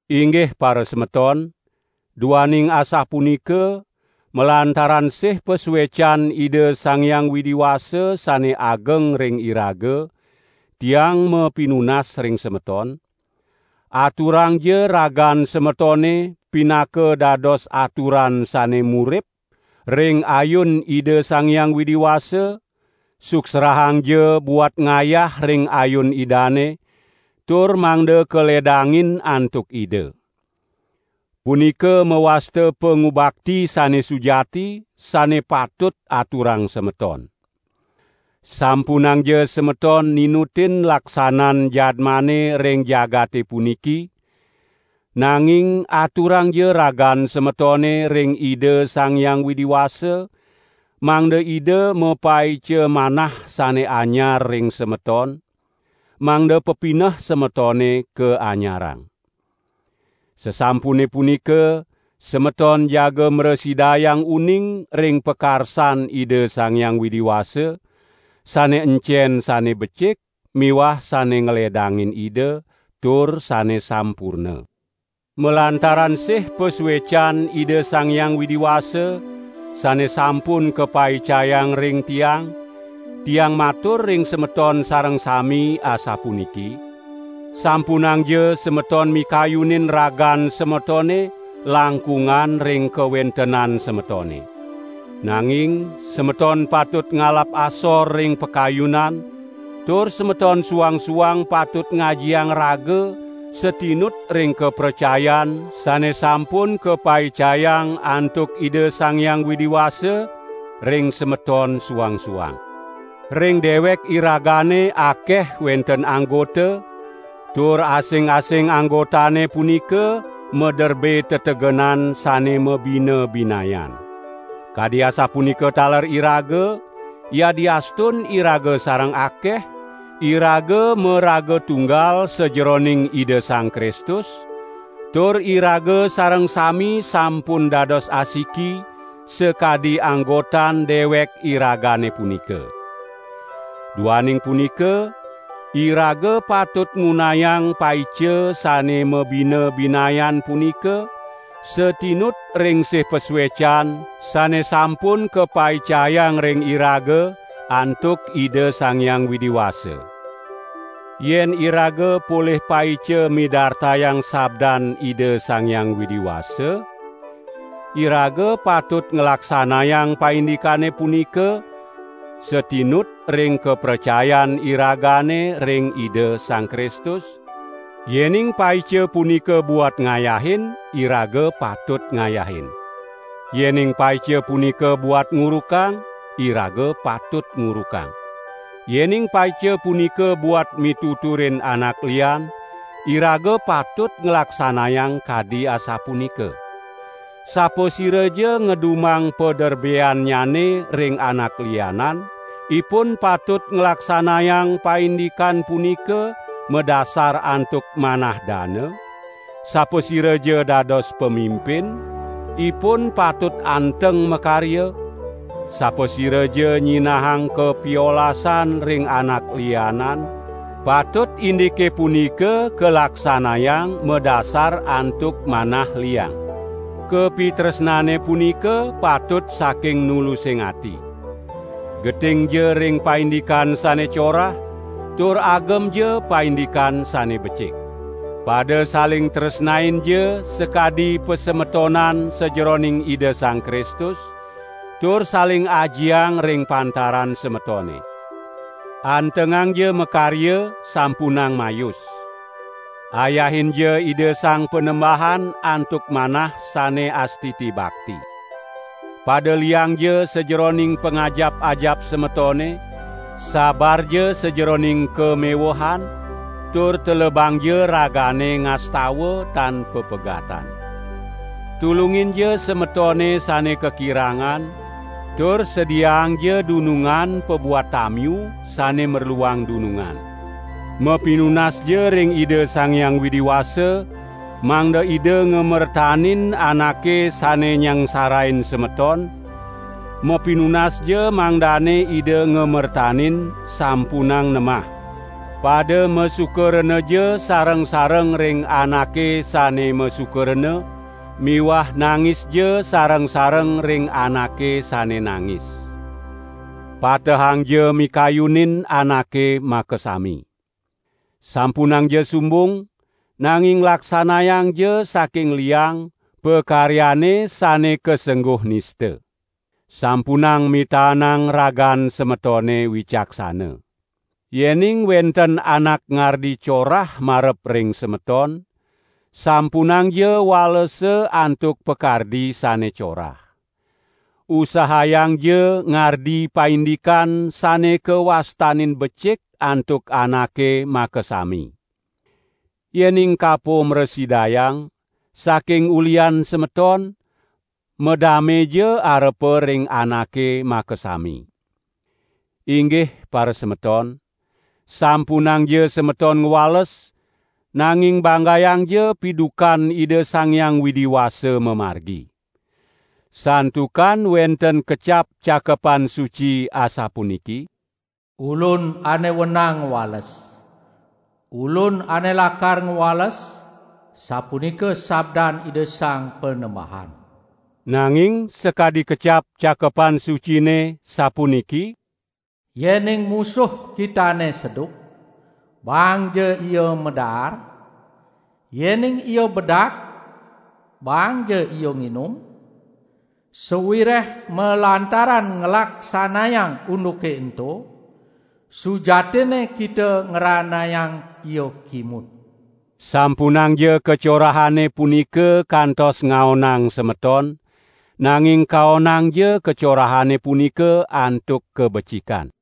Inggih parasemeton! Duaning asapunika, malantaran sih pasuecan Ida Sang Hyang Widi Wasa sane ageng ring iraga, tiang mapinunas ring semeton: Aturangja ragan semetone pinaka dados aturan sane murip, ring ayun Ida Sang Hyang Widi Wasa, suksrahangja buat ngayah ring ayun Idane, tur mangda kaledangin antuk Ida. Punika mawasta pangubakti sane sujati, sane patut aturang semeton. Sampunangja semeton ninutin laksanan jadmane ring jagate puniki, nanging aturangja ragan semetone ring Ida Sang Hyang Widi Wasa mangda Ida mapaica manah sane anyar ring semeton, mangda pepineh semetone kaanyarang. Sasampune punika semeton jaga mrasidayang uning ring pakarsan Ida Sang Hyang Widi Wasa, sane encen sane becik miwah sane ngledangin Ida, tur sane sampurna. Malantaran sih pasuecan Ida Sang Hyang Widi Wasa sane sampun kapaicayang ring tiang, tiang matur ring semeton sareng sami asapuniki: Sampunangja semeton mikayunin ragan semetone langkungan ring kawentenan semetone. Nanging semeton patut ngalap asor ring pakayunan, tur semeton suang-suang patut ngajiang raga satinut ring kapracayan sane sampun kapaicayang antuk Ida Sang Hyang Widi Wasa ring semeton suang-suang. Ring dewek iragane akeh wenten anggota, tur asing-asing anggotane punika maderbe tetegenan sane mabina-binayan. Kadi asapunika taler iraga, yadiastun iraga sareng akeh, iraga maraga tunggal sajeroning Ida Sang Kristus, tur iraga sareng sami sampun dados asiki, sakadi anggotan dewek iragane punika. Duaning punika, iraga patut ngunayang paica sane mabina-binayan punika satinut ring sih pasuecan sane sampun kapaicayang ring iraga antuk Ida Sang Hyang Widi Wasa. Yen iraga polih paica midartayang sabdan Ida Sang Hyang Widi Wasa, iraga patut nglaksanayang paindikane punika, satinut ring kapracayan iragane ring Ida Sang Kristus. Yening paica punika buat ngayahin, iraga patut ngayahin. Yening paica punika buat ngurukang, iraga patut ngurukang. Yening paica punika buat mituturin anak lian, iraga patut nglaksanayang kadi asapunika. Sapasiraja ngedumang paderbeannyane ring anak lianan, ipun patut nglaksanayang paindikan punika madasar antuk manah dana; sapasiraja dados pamimpin, ipun patut anteng makarya; sapasiraja nyinahang kapiolasan ring anak lianan, patut indike punika kalaksanayang madasar antuk manah liang. Kapitresnane punika patut saking nulusing ati. Getingja ring paindikan sane corah, tur agemja paindikan sane becik. Pada saling tresnainja sakadi pasemetonan sajeroning Ida Sang Kristus, tur saling ajiang ring pantaran semetone. Antengangja makarya, sampunang mayus. Ayahinja Ida Sang Panembahan antuk manah sane astiti bakti. Pada liangja sajeroning pangajap-ajap semetone, sabarja sajeroning kamewehan, tur telebangja ragane ngastawa tan papegatan. Tulunginja semetone sane kakirangan, tur sediaangja dunungan pabuat tamiu sane merluang dunungan. Mapinunasja ring Ida Sang Hyang Widi Wasa, mangda Ida ngamertanin anake sane nyangsarain semeton; mapinunasja mangdane Ida ngamertanin, sampunang nemah. Pada masuka renaja sareng-sareng ring anake sane masuka rena miwah nangisja sareng-sareng ring anake sane nangis. Patehangja mikayunin anake makasami. Sampunangja sumbung, nanging laksanayangja saking liang, pakaryane sane kasengguh nista. Sampunang mitaenang ragan semetone wicaksana. Yening wenten anak ngardi corah marep ring semeton, sampunangja walesa antuk pakardi sane corah. Usahayangja ngardi paindikane sane kawastanin becik antuk anake makasami. Yening kapo mrasidayang, saking ulihan semeton, madameja arepa ring anake makasami. Inggih parasemeton! Sampunangja semeton ngwales, nanging banggayangja pidukan Ida Sang Hyang Widi Wasa mamargi. Santukan wenten kecap Cakepan Suci asapuniki: "Ulun ane wenang ngwales. Ulun ane lakar ngwales, sapunika sabdan Ida Sang Panembahan." Nanging sakadi kecap Cakepan Sucine, sapuniki: "Yening musuh kitane seduk, baangja ia madaar, yening ia bedak baangja ia nginum; sawireh malantaran nglaksanayang unduke ento, sujatinne kita ngranayang ia kimud." Sampunangja kacorahane punika kantos ngaonang semeton, nanging kaonangja kacorahane punika antuk kabecikan.